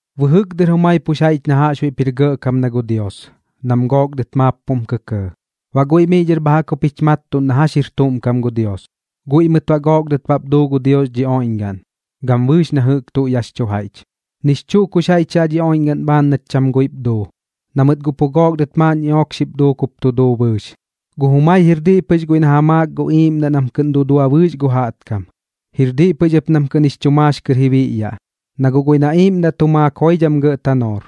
Bɨjɨk dɨr jumai pux jaiꞌch na jaꞌxbuiꞌp jir gɇꞌkam na gu Dios, nam gook dɨt maap pum kɇkɇɇ. Baꞌ guiꞌ miꞌ dhɨr bha jaꞌk jup jich mattuꞌn na jax jir tuꞌm kam gu Dios. Guiꞌ mɨt baꞌ gook dɨt bap duu gu Dios dhi oiꞌñgaꞌn, gam bɨɨx na jɨꞌk tuꞌ yaꞌx chu jaiꞌch. Nix chuꞌ kux jaiꞌch yaꞌ dhi oiꞌñgaꞌn bhaan nat cham guiꞌp duu, na mɨt guꞌ pu gook dɨt maaꞌn ñiꞌook xip duuk jup tu duu bɨɨx. Gu jumai jir diꞌ pɨx guiꞌ na ja maak gu iiꞌmdaꞌ nam kɨꞌn dudua bɨɨx gu jaꞌtkam. Jir diꞌ pɨx ɨp nam kɨꞌn jix chu maax kɨr ji biꞌyaꞌ, na guꞌ guiꞌ na iiꞌmdaꞌ tu maak joidham gɇꞌ tanoor.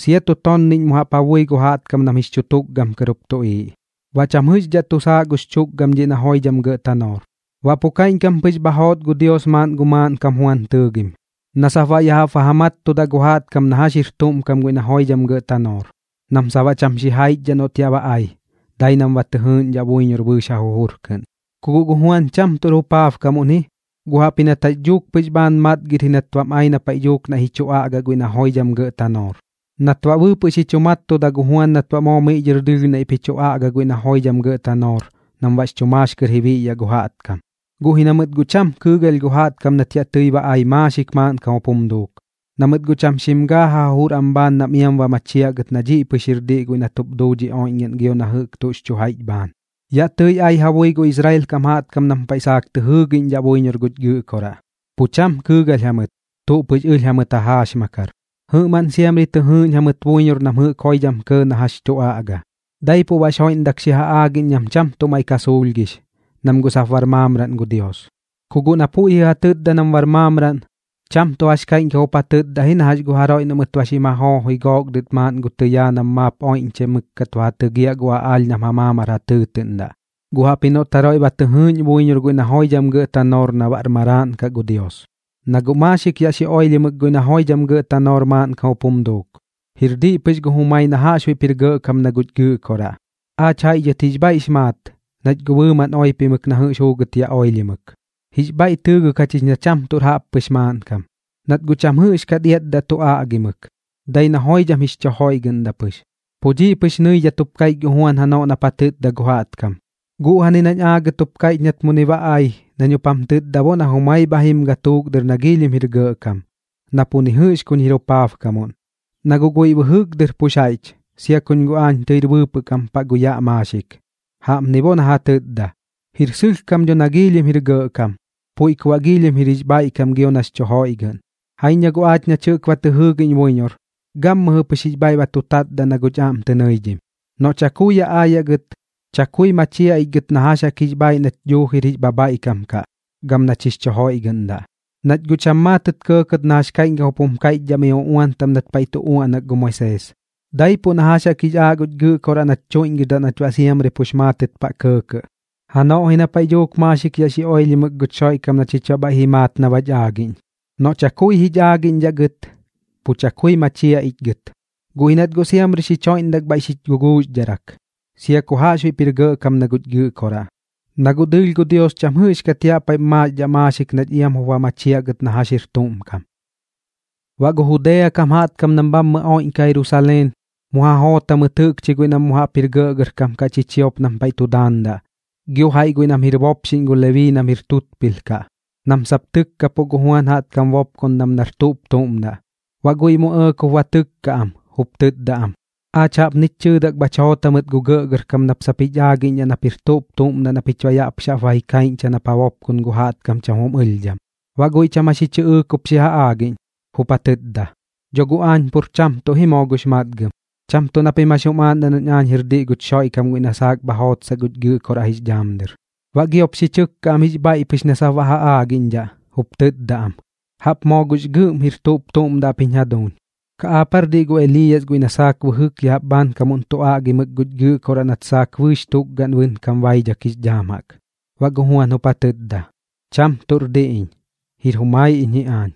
Sia tu tonniꞌñ mu jaꞌp ja bui gu jaꞌtkam nam jix chu tukgam kɨr jup tuꞌiiꞌ, baꞌ cham jɨꞌxdhaꞌ tu saaꞌ gux chukgam dhiꞌ na joidham gɇꞌ tanoor. Baꞌ pu kaiꞌñkam pɨx bha joot gu Dios maaꞌn gu maaꞌnkam Juan tɨɨgim, na sap baꞌ ya jaꞌp ba ja mattudaꞌ gu jaꞌtkam na jax jir tuꞌm kam guiꞌ na joidham gɇꞌ tanoor, nam sap baꞌ cham xijaichdhaꞌ noꞌt yaꞌ ba ai, dai nam ba tɨ jɨɨꞌñdhaꞌ buiñor bɨɨx ja jujur kɨꞌn. Ku guꞌ gu Juan cham tuꞌr jupaabkamuꞌn ji, guꞌ jaꞌpji nat jax dhuuk pɨx bhaan matgɨr ji nat bam ai na paiꞌ dhuuk naiꞌ ji chu aꞌagaꞌ guiꞌ na joidham gɇꞌ tanoor. Nat baꞌ bɨɨpɨꞌ xi chu mattuda gu Juan nat baꞌ moo miꞌ dhɨr dɨɨlh naiꞌp ji chu aꞌgaꞌ guiꞌ na joidham gɇꞌ tanoor, nam baꞌx chu maax kɨr ji biꞌyaꞌ gu jaꞌtkam. Guꞌ ji na mɨt guꞌ cham kɨɨgalh gu jaꞌtkam nat yaꞌ tɨi ba ai maaxik maaꞌnkam jup jum duuk, na mɨt guꞌ cham xim gaa ja jujur am bhaan nam iam ba machiaꞌ gɨt na dhiꞌ pɨx jir diꞌ guiꞌ nat jup duu dhi oiꞌñgaꞌn gio na jɨꞌk tuꞌx chu jaiꞌch bhaan. Yaꞌ tɨi ai ja bui gu Israel kam jaꞌtkam nam paiꞌ saak tɨ jɨɨgiꞌñdhaꞌ buiñor guch Gɨꞌkoraꞌ. Pu cham kɨɨgalh jamɨt, tuꞌ pɨx ɨlh jamɨt ja jaaxmakar. Jɨꞌmaꞌn siamri tɨ jɨɨꞌñ jamɨt buiñor nam jɨꞌk joidham kɇɇ na jax tu aꞌga. Daipuiꞌ baꞌx joiꞌndak xi ja aagiꞌñ nam cham tuꞌ maiꞌ ka suulhgix, nam guꞌ sap bar maamraꞌn gu Dios. Ku guꞌ na puiꞌ jɨꞌ ja tɨtda nam bar maamraꞌn, cham tuꞌ jax kaiꞌñkam jup ja tɨtda ji na jax gu jaroiꞌ noꞌ mɨt ba xim ja joojoi gook dɨt maaꞌn gu tɨyaa nam maap oiꞌñchai mɨkkat ba ja tɨgiaꞌ gu aꞌaalh nam ja maamar jum tɨɨtɨꞌndaꞌ, guꞌ jaꞌpji noꞌt jaroiꞌ ba tɨ jɨɨꞌñ buiñor guiꞌ na joidham gɇꞌ tanoor na baꞌr maraaꞌn kaꞌ gu Dios. Na guꞌ maaxik yaꞌ xi oilhimɨk guiꞌ na joidham gɇꞌ tanoor maaꞌnkam jup jum duuk. Jir diꞌ pɨx gu jumai na jaꞌxbuiꞌp jir gɇꞌkam na guch Gɨꞌkoraꞌ. Aach jaiꞌ dhɨt jix bhaiꞌx maat, nach guꞌ bɨɨmaꞌn oipimɨk na jɨꞌx juugɨt yaꞌ oilhimɨk. Jix bhaiꞌ tɨɨgɨk jachich na cham tuꞌr jaꞌppɨx maaꞌnkam, nat guꞌ cham jɨꞌxkat iatdaꞌ tu aꞌgimɨk, dai na joidham jix chu joiꞌgɨꞌndaꞌ pɨx. Pu dhiꞌ pɨx nɨidhat jup kaiꞌch gu Juan janoꞌ nap ja tɨtda gu jaꞌtkam: ―Guꞌjani nañ aagɨt jup kaiꞌch nat muni ba ai, nañ jup jam tɨtda bo na jumai bha jim gatuuk dɨr na giilhim jir gɇꞌkam, na pu ni jɨꞌx kuñ jir jupaabkamuꞌn. Na guꞌ guiꞌ bɨjɨk dɨr pux jaiꞌch, sia kuñ guꞌ aañ tɨir bɨɨpɨꞌ kam paꞌ gu yaꞌ maaxik. Jaꞌpni bo na ja tɨtda. Jir sɨlhkam dho na giilhim jir gɇꞌkam, puiꞌ ku baꞌ giilhim jir jix bhaiꞌkam gio nax chu joiꞌgɨꞌn. Jaiñ na guꞌ aach nach jɨꞌk ba tɨ jɨɨgiꞌñ buiñor, gammɨjɨ pɨx jix bhaiꞌ ba tu tatdaꞌ na guꞌch aꞌm tɨ nɨidhim. Noꞌ chakui yaꞌ aayaꞌ gɨt, chakui machiaꞌ ich gɨt na jax jaꞌk jix bhaaiꞌ nach dhuuji jir jix bhabhaiꞌkam kaꞌ gam nach jix chu joiꞌgɨꞌndaꞌ. Nach guꞌ cham maatɨt kɇɇkɇt na jax kaiꞌñkam jup jum kaiꞌchdhaꞌ mi uꞌuan taꞌm nat paiꞌ tu uaꞌnak gu Moisees, daipuꞌ na jax jaꞌk jix aaꞌ guch Gɨꞌkoraꞌ nach chuiꞌñgɨdaꞌ nach baꞌ siamri pux maatɨt paꞌ kɇɇkɇꞌ. Janoꞌ ji na paiꞌ dhuuk maaxik yaꞌ xi oilhimɨk guch Xoiꞌkam na chich baꞌ bhaiꞌ ji maat na bach aagiꞌñ. Noꞌ chakui jich aagiꞌñdhaꞌ gɨt, pu chakui machiaꞌ ich gɨt. Guꞌ ji nat guꞌ siamri xich joiꞌndak bhaiꞌ xich guguuxdharak, sia ku jaꞌxbuiꞌp jir gɇꞌkam na guch Gɨꞌkoraꞌ, na guꞌ dɨɨlh gu Dios cham jɨꞌxkat yaꞌ paiꞌm maaxdhaꞌ maaxik nach gɨt iam jup ba machiaꞌ na jax jir tuꞌm kam. Baꞌ gu Judea kam jaꞌtkam nam bhammɨ oiꞌñkaꞌ Jerusaleen, mu ja joot jamɨt jɨꞌkchi guiꞌ nam mu jaꞌp jir gɇꞌgɇrkam kaꞌ chichiop nam paiꞌ tu daandaꞌ, gio jaiꞌ guiꞌ nam jir bopxiꞌñ gu Lebii nam jir tutpilh kaꞌ, nam sap tɨkkapuꞌ gu Juan jaꞌtkam bopkondam nar tuꞌp tuꞌm daꞌ. Baꞌ guiꞌ mu ɇɇk jup ba tɨkka am, jup tɨtda am: ―Aach jaꞌpnich chɨɨdak bhach joot jamɨt gu gɇꞌgɇrkam nap sap jich aagiꞌñdhaꞌ nap jir tuꞌp tuꞌm daꞌ na pich baꞌ yaꞌ pɨx ba ji kaiꞌñcha nap ja bopkon gu jaꞌtkam cham jum ɨlhdham. Baꞌ guiꞌ cham jax ji chɨꞌɨɨk jup xi ja aagiꞌñ, jup ja tɨtda: ―Dho guꞌ aañ pur cham tuꞌ ji moo gux matgam. Cham tuꞌ na pim jax jum aaꞌndaꞌ nañ aañ jir diꞌ guch Xoiꞌkam guiꞌ na saak bha jootsaꞌ guch Gɨꞌkoraꞌ jix dhaam dɨr. Baꞌ giop xi chɨkka am jix bhaiꞌ pɨx na sap baꞌ ja aagiꞌñdhaꞌ, jup tɨtda am: ―¿Jaꞌp moo gux gɨꞌm jir tuꞌp tuꞌm daꞌ ap jiñ jaduuñ? ¿Kaꞌ aap aar diꞌ gu Eliiyas guiꞌ na saak bɨjɨk ya jaꞌp bhaankamuꞌn tu aꞌgimɨk guch Gɨꞌkoraꞌ nat saak bɨɨx tukgaꞌn bɨnkam baidhak jix dhaam jaꞌk? Baꞌ gu Juan jup ja tɨtda: ―Cham tuꞌr diꞌ iñ, jir jumai iñ ji aañ.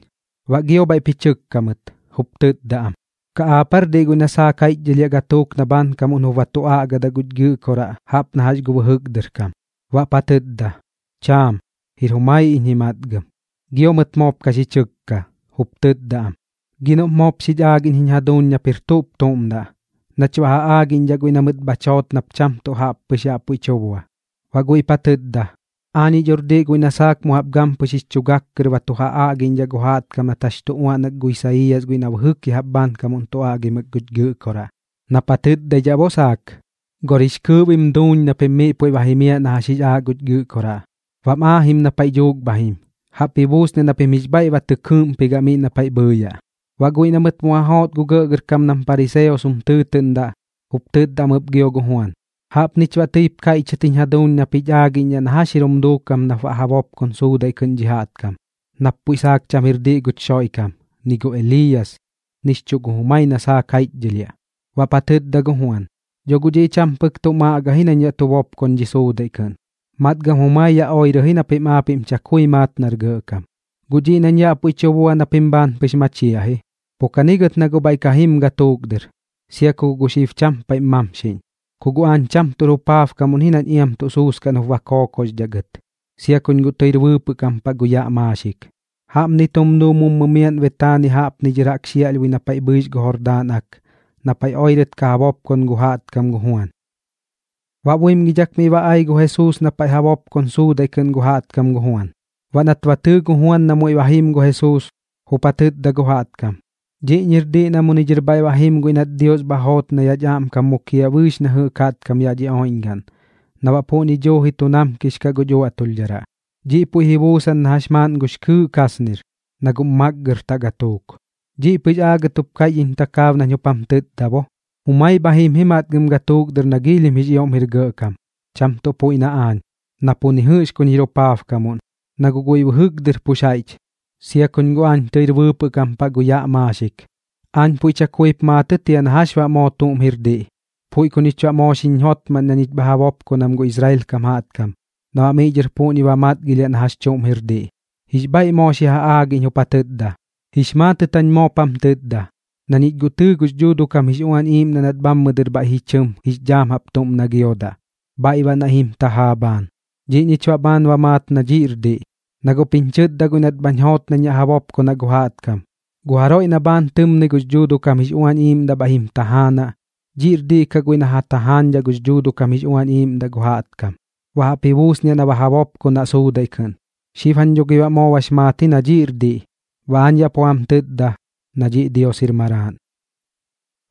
Baꞌ gio bhaiꞌp ji chɨkka mɨt, jup tɨtda am: ―¿Kaꞌ aap aar diꞌ guiꞌ na saak jaiꞌchdhɨlhiaꞌ gatuuk na bhaankamuꞌn jup tu aꞌgaꞌ guch Gɨꞌkoraꞌ jaꞌp na jax gu bɨjɨk dɨr kam? Baꞌp ja tɨtda: ―Chaam. Jir jumai iñ ji matgam. Gio mɨt moop ka xi chɨkka, jup tɨtda am: ―Gi noꞌp moop xich aagiꞌñ jiñ jaduuñ nap jir tuꞌp tuꞌm daꞌ, nach baꞌ ja aagiꞌñdhaꞌ guiꞌ na mɨt bhach joot nap cham tuꞌ jaꞌp pɨx yaꞌ puiꞌ tu bua. Baꞌ guiꞌp ja tɨtda: ―Aañiꞌ dhor diꞌ guiꞌ na saak mu jaꞌp gampɨx jix chu gak kɨr ba tu ja aꞌgiꞌñdhaꞌ gu jaꞌtkam nat jax tu uaꞌnak gu Isaiiyas guiꞌ na bɨjɨk ya jaꞌp bhaankamuꞌn tu aꞌgimɨk guch Gɨꞌkoraꞌ, nap ja tɨtdaidhaꞌ bo saak: “Gor jix kɨɨꞌ bim duuñ na pim miꞌ puiꞌ ba jimiaꞌ na jax jix aaꞌ guch Gɨꞌkoraꞌ. Bam aajim na paiꞌ dhuuk bha jim. Jaꞌp ji buusniaꞌ na pim jix bhaiꞌ ba tɨ kɨɨꞌmpigaꞌ miꞌ na paiꞌ bhɨɨyaꞌ.” Baꞌ guiꞌ na mɨt mu ja joot gu gɇꞌgɇrkam nam pariseos jum tɨɨtɨꞌndaꞌ, jup tɨtda am ɨp gio gu Juan: ―Jaꞌpnich baꞌ tɨip kaiꞌchɨt jiñ jaduuñ nap jich aagiꞌñdhaꞌ na jax jir jum duukam nap baꞌ ja bopkon suudaiꞌ kɨꞌn dhi jaꞌtkam, nap puiꞌ saak cham jir diꞌ guch Xoiꞌkam, ni gu Eliiyas, nix chuꞌ gu jumai na saak jaiꞌchdhɨlhiaꞌ. Baꞌp ja tɨtda gu Juan: ―Dho guꞌ dhiꞌ cham pɨk tuꞌm aꞌga ji nañ yaꞌ tu bopkon dhi suudaiꞌ kɨꞌn, matgam jumai yaꞌ oirɨ ji na pim aapiꞌm chakui maat nar gɇꞌkam. Guꞌ dhiꞌ nañ yaꞌ puiꞌ tu bua na pim bhaan pɨx machiaꞌ ji. Pu kani gɨt na guꞌ bhaiꞌ ka jim gatuuk dɨr, sia ku guꞌ gu xib cham paiꞌm mamxiꞌñ. Ku guꞌ aañ cham tuꞌr jupaabkamuꞌn ji nañ iam tuꞌ suuskaꞌn jup ba kookoxdhaꞌ gɨt, sia kuñ guꞌ tɨir bɨɨpɨꞌ kam paꞌ gu yaꞌ maaxik. Jaꞌpni tum duu mummu miaꞌn Betaania jaꞌpni dhɨr jaꞌk xiaꞌlhbui na paiꞌ bhɨix gu Jordaan Ak, na paiꞌ oirɨt ka ja bopkon gu jaꞌtkam gu Juan. Baꞌ buimgidhak miꞌ ba ai gu Jesuus na paiꞌ ja bopkon suudaiꞌ kɨꞌn gu jaꞌtkam gu Juan. Baꞌ nat ba tɨɨ gu Juan na muiꞌ ba jim gu Jesuus, jup ja tɨtda gu jaꞌtkam: ―Dhiꞌñir diꞌ na muni dhɨr bhaiꞌ ba jim guiꞌ nat Dios bha joot nach aꞌmkam mukiaꞌ bɨɨx na jɨꞌk jaꞌtkam yaꞌ dhi oiꞌñgaꞌn, na baꞌ puꞌñi dhuuji tu namkix kaꞌ guch uaꞌtulhdharaꞌ. Dhiꞌ puiꞌ ji buusan na jax maaꞌn gux kɨɨꞌ kasnir, na guꞌm makgartaꞌ gatuuk. Dhiꞌ pɨx aagɨt jup kaiꞌch iñ takaab nañ jup jam tɨtda bo: “Jumai bha jim ji matgam gatuuk dɨr na giilhim jix ioꞌm jir gɇꞌkam, cham tuꞌ puiꞌ na aañ, na pu ni jɨꞌx kuñ jir jupaabkamuꞌn, na guꞌ guiꞌ bɨjɨk dɨr pux jaiꞌch, sia kuñ guꞌ aañ tɨir bɨɨpɨꞌ kam paꞌ gu yaꞌ maaxik.” Aañ puiꞌ chakuip maatɨt jia na jax baꞌ moo tuꞌm jir diꞌ, puiꞌ ku ñich baꞌ moo xiñ jotmaꞌn na ñich bha ja bopkonam gu Israel kam jaꞌtkam, na baꞌ miꞌ dhɨr puꞌñi ba matgilhiaꞌ na jax chuꞌm jir diꞌ. Jix bhaiꞌ moo xi ja aagiꞌñ, jup ja tɨtda: ―Jix maatɨt jañ moop jam tɨtda, na ñich guꞌ tɨɨ gux Dhuuduꞌ kam jix Uañ Iiꞌmdaꞌ nat bhammɨni dhɨr bhaiꞌ ji chɨm jix dhaam jaꞌp tuꞌm na giodaꞌ, bhaiꞌ baꞌ naiꞌ jim tajaa bhaan. Dhiꞌ ñich baꞌ bhaan ba maat na dhiꞌr diꞌ, na guꞌp jiñ chɨtda guiꞌ nat bhañ joot nañ yaꞌ ja bopkonaꞌ gu jaꞌtkam: “Gu jaroiꞌ na bhaan tɨmnɨi gux Dhuuduꞌ kam jix Uañ Iiꞌmdaꞌ bhaiꞌ jim tajaanaꞌ, dhiꞌr diꞌ kaꞌ guiꞌ na ja tajaañdhaꞌ gux Dhuuduꞌ kam jix Uañ Iiꞌmdaꞌ gu jaꞌtkam. Baꞌ jaꞌp ji buusniaꞌ na ja bopkonaꞌ suudaiꞌ kɨꞌn.” Xib jañ dho gi baꞌ moo bax maat ji na dhiꞌr diꞌ, baꞌ aañ yaꞌ pu jam tɨtda, na dhiꞌ Dios jir Maraaꞌn.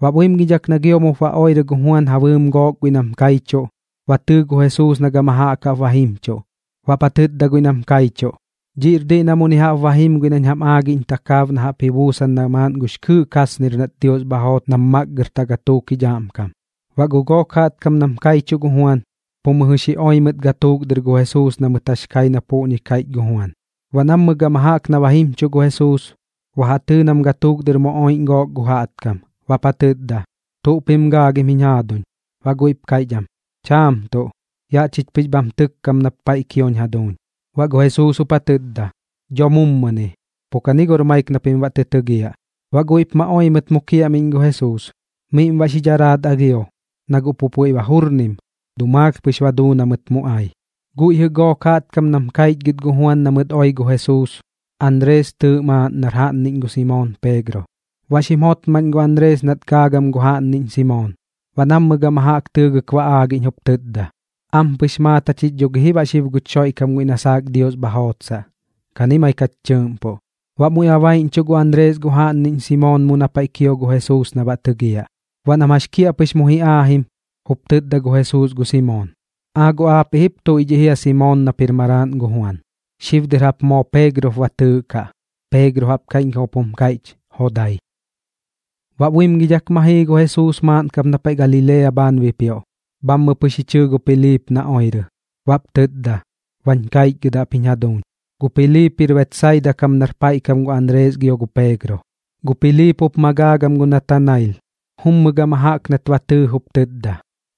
Baꞌ buimgidhak na gio mup ba oirɨ gu Juan ja bɨɨm gook guiꞌ nam kaichuꞌ, ba tɨɨ gu Jesuus na gama jaꞌk jaꞌp ba jimchuꞌ. Baꞌp ja tɨtda guiꞌ nam kaichuꞌ: ―Dhiꞌr diꞌ na muni jaꞌp ba jim guiꞌ nañ jam aagiꞌñ takaab na jaꞌp ji buusan na maaꞌn gux kɨɨꞌ kasnir nat Dios bha joot nam matgartaꞌ gatuuk jich aꞌmkam. Baꞌ gu gook jaꞌtkam nam kaichuꞌ gu Juan, pu mɨjɨ xi oi mɨt gatuuk dɨr gu Jesuus na mɨt jax kai na puꞌñi jɨꞌ kaiꞌch gu Juan. Baꞌ nammɨ gama jaꞌk na ba jimchuꞌ gu Jesuus, ba ja tɨɨ nam gatuuk dɨr mu oiꞌñ gook gu jaꞌtkam, baꞌp ja tɨtda: ―¿Tuꞌ pim gaagim jiñ jaaduñ? Baꞌ guiꞌp kaiꞌch am: ―Chaam tuꞌ. Yaꞌ chich pɨx bham tɨkkam nap paiꞌ kioñ jaduuñ. Baꞌ gu Jesuus jup ja tɨtda: ―Dho mummuni. Pu kani gor maik na pim baꞌ tɨ tɨgiaꞌ. Baꞌ guiꞌp ma oi mɨt mu kiaꞌmiꞌñ gu Jesuus. Miꞌm baꞌ xi dharaat alhio, na guꞌ pu puiꞌ ba jurnim, dumaalh pɨx ba duu na mɨt mu ai. Guiꞌ jɨꞌ gook jaꞌtkam nam kaichgɨt gu Juan na mɨt oi gu Jesuus, Anrees tɨɨꞌ maaꞌn nar jaꞌnniꞌñ gu Simoon Peegro. Baꞌ xim jotmaꞌn gu Anrees nat gaagam gu jaꞌnniꞌñ Simoon. Baꞌ nammɨ gama jaꞌk tɨɨgɨk ba aagiꞌñ, jup tɨtda: ―Ampɨx maat jachich dho gi ji baꞌ guch Xoiꞌkam guiꞌ na saak Dios bha jootsaꞌ. Kani maik jach tɨɨꞌmpuꞌ. Baꞌ muiꞌ ba baiꞌñchuꞌ gu Anrees gu jaꞌnniꞌñ Simoon mu na paiꞌ kio gu Jesuus na baꞌ tɨgiaꞌ. Baꞌ nam jax kiaꞌpɨx mu ji aajim, jup tɨtda gu Jesuus gu Simoon: ―¡Aa guꞌ aapiꞌ jip tuiꞌdhiꞌ jia Simoon nap jir maraaꞌn gu Juan! Xib dɨr jaꞌp moo Peegro jup ba tɨɨꞌkaꞌ. ―Peegro jaꞌp kaiꞌñkam jup jum kaiꞌch: Jodai. Baꞌ buimgidhak ma jii gu Jesuus maaꞌn kap na paiꞌ Galilea bhaan bipioꞌ. Bhammɨ pɨx ji chɨɨ gu Piliip na oirɨ. Baꞌp tɨtda: ―Bañ kaichgɨdaꞌ ap jiñ jaduuñ. Gu Piliip jir Betsaida kam nar paiꞌ kam gu Anrees gio gu Peegro. Gu Piliip jup ma gaagam gu Natanail, jummɨ gama jaꞌk nat ba tɨɨ jup tɨtda: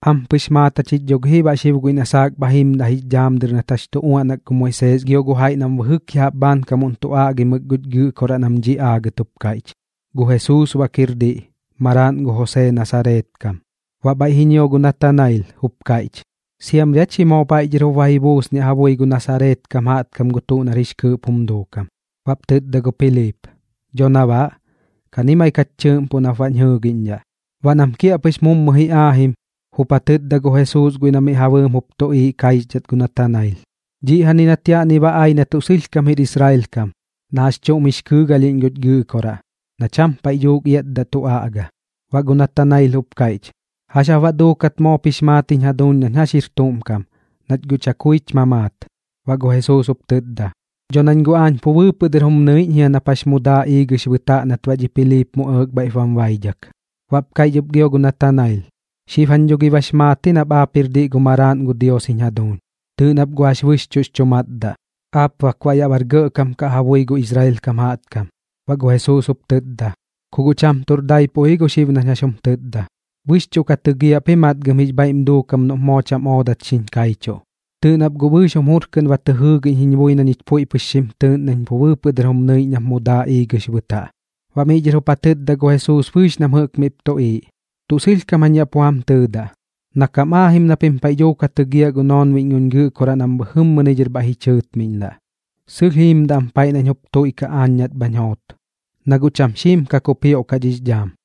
―Ampɨx maat jachich dho gi ji baꞌ xib guiꞌ na saak bha jimdaꞌ jix dhaam dɨr nat jax tu uaꞌnak gu Moisees gio gu jaiꞌ nam bɨjɨk ya jaꞌp bhaankamuꞌn tu aꞌgimɨk guch Gɨꞌkoraꞌ nam dhiꞌ aagɨt jup kaiꞌch. Gu Jesuus bak jir diꞌ, maraaꞌn gu Josee Nasareet kam. Baꞌ bhaiꞌ ji ñio gu Natanail, jup kaiꞌch: ―¿Siamri aa chi moo bhaiꞌ dhɨr jup ba ji buusniaꞌ ja bui gu Nasareet kam jaꞌtkam gu tuꞌ nar jix kɨɨꞌp jum duukam? Baꞌp tɨtda gu Piliip: ―Dho na baꞌ. Kani gɨt maik jach tɨɨꞌmpuꞌ nap baꞌñ jɨɨgiꞌñdhaꞌ. Baꞌ nam kiaꞌpɨx mummu ji aajim, jup ja tɨtda gu Jesuus guiꞌ na miꞌ ja bɨɨm jup tuꞌiiꞌ kaixdhat gu Natanail: ―Dhiꞌjani nat yaꞌni ba ai na tuꞌ sɨlhkam jir Israel kam, na jax chuꞌm jix kɨɨgalhiꞌñ guñ Gɨꞌkoraꞌ, na cham paiꞌ dhuuk iatdaꞌ tu aꞌga. Baꞌ gu Natanail jup kaiꞌch: ―¿Jax jap baꞌ duukat moop jix maat jiñ jaduuñ nañ jax jir tuꞌm kam, nach guꞌ chakuich mamaat? Baꞌ gu Jesuus jup tɨtda: ―Dho nañ guꞌ aañ pu bɨɨpɨꞌ dɨr jum nɨiꞌñ jia nap jax mu daa iigɨx bɨtaꞌ nat baꞌ dhi Piliip mu ɇɇk bhaiꞌp bam baidhak. Baꞌp kaiꞌch ɨp gio gu Natanail: ―Xib jañ dho gi bax maat ji nap aap jir diꞌ gu Maraaꞌn gu Dios jiñ jaduuñ. Tɨɨꞌ nap guꞌ jax bɨxchuꞌx chu matdaꞌ. Aap bak baꞌ yaꞌ bar gɇꞌkam kaꞌ ja bui gu Israel kam jaꞌtkam. Baꞌ gu Jesuus jup tɨtda: ―Ku guꞌ cham tuꞌr daipuꞌ ji gu xib nañ jax jum tɨtda. Bɨxchuꞌ ka tɨgiaꞌ ap ji matgam jix bhaiꞌm duukam noꞌp moo cham oodat xiñ kaichuꞌ. Tɨɨꞌ nap guꞌ bɨɨx jum jur kɨꞌn ba tɨ jɨɨgiꞌñ jiñ bui na ñich puiꞌ xim tɨɨꞌn nañ pu bɨɨpɨꞌ dɨr jum nɨiꞌñ nap mu daa iigɨx bɨtaꞌ. Baꞌ miꞌ dhɨr jup ja tɨtda gu Jesuus bɨɨx nam jɨꞌk miꞌp tuꞌiiꞌ: ―Tuꞌ sɨlhkam jañ yaꞌ pu jam tɨɨdaꞌ, na kam aajim na pim paiꞌ dhuuk ja tɨgiaꞌ gu noonbiꞌñ guñ Gɨꞌkoraꞌ nam bhɨjɨmmɨni dhɨr bhaiꞌ ji chɨɨtmiꞌndaꞌ, sɨlh jiimdaꞌ am paiꞌ nañ jup tuiꞌkaꞌ aañ nat bhañ joot, na guꞌ cham xiim ka kupioꞌkaꞌ dhix dhaam.